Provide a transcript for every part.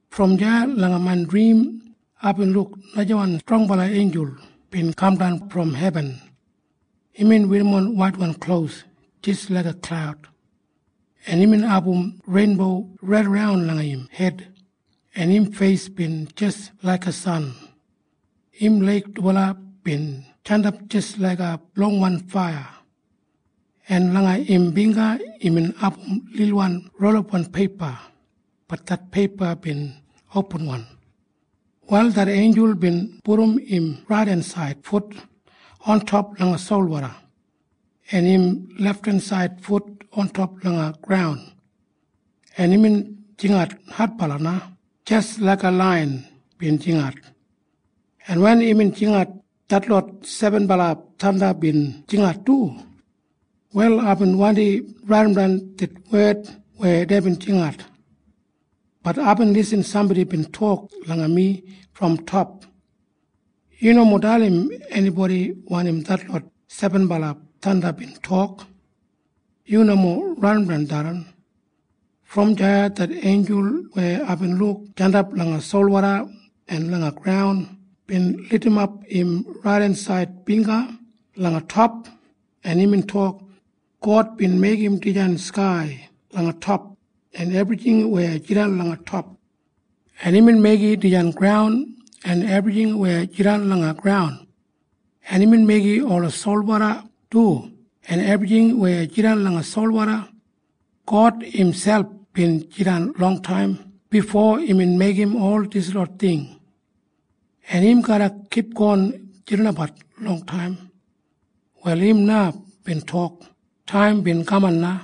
Brom deya langa main drim aibin luk najawan strongbala einjul bin kamdan brom hebin. Imbin werrimon waitwan klos jis laiga klaud, en imbin abum reinbo raidaran langa im hed, en im feis bin jis laiga san. Im leig dubala bin jandap jis laiga longwan faiya, en langa im bingga imbin abum lilwan rolapwan peipa. Bat det peipa bin opinwan. Wal det einjul bin pudum im raidensaid fut ontop langa solwoda en im lefthensaid fut ontop langa graun, en imbin jingat adbala na jis laiga laiyan bin jingat, en wen imbin jingat, detlot sebenbala thanda bin jingat du. Wal aibin wandi raidimdan det wed weya deibin jingat. Bat aibin lisin sambodi bin tok langa mi brom top, “Yu nomo dalim enibodi wanim detlot sebenbala thanda bin tok. Yu nomo raidimdan tharran.” Brom deya det einjul weya aibin luk jandap langa solwoda en langa graun bin lidimap im raidensaid bingga langa top, en imbin tok, “God bin meigim dijan skai langa top en ebrijing weya jidan langa top, en imbin meigim dijan graun en ebrijing weya jidan langa graun, en imbin meigim ola solwoda du en ebrijing weya jidan langa solwoda. God imselp bin jidan longtaim bifo imbin meigim ol dislot ting, en im garra kipgon jidanbat longtaim. Wal im na bin tok taim bin kaman na.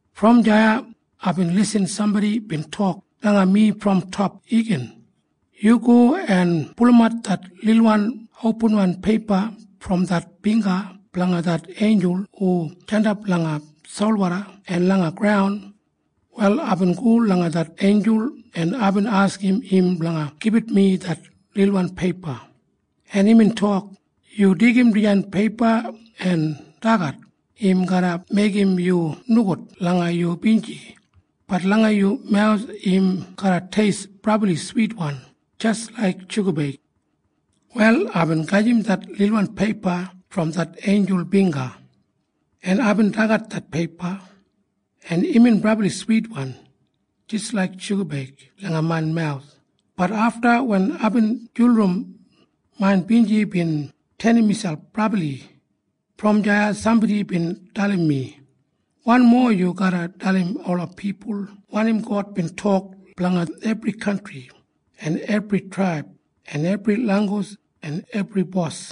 Brom deya aibin lisin sambodi bin tok langa mi brom top igin, “Yu go en pulumat det lilwan opinwan peipa brom det bingga blanga det einjul hu jandap langa solwoda en langa graun.” Wal aibin go langa det einjul, en aibin askim im blanga gibit mi det lilwan peipa, en imbin tok, “Yu deigim dijan peipa en dagat. Im garra meigim yu nogud langa yu binji. Bat langa yu mawus im garra teist brabli switwan jis laik shugabeig.” Wal aibin gajim det lilwan peipa brom det einjul bingga, en aibin dagat det peipa, en imbin brabli switwan jis laik shugabeig langa main mawus. Bat afta wen aibin julurum, main binji bin tenim miselp brabli. Brom deya sambodi bin dalim mi, “Wanmo yu garra dalim ola pipul wanim God bin tok blanga ebri kantri en ebri traib en ebri langgus en ebri bos.”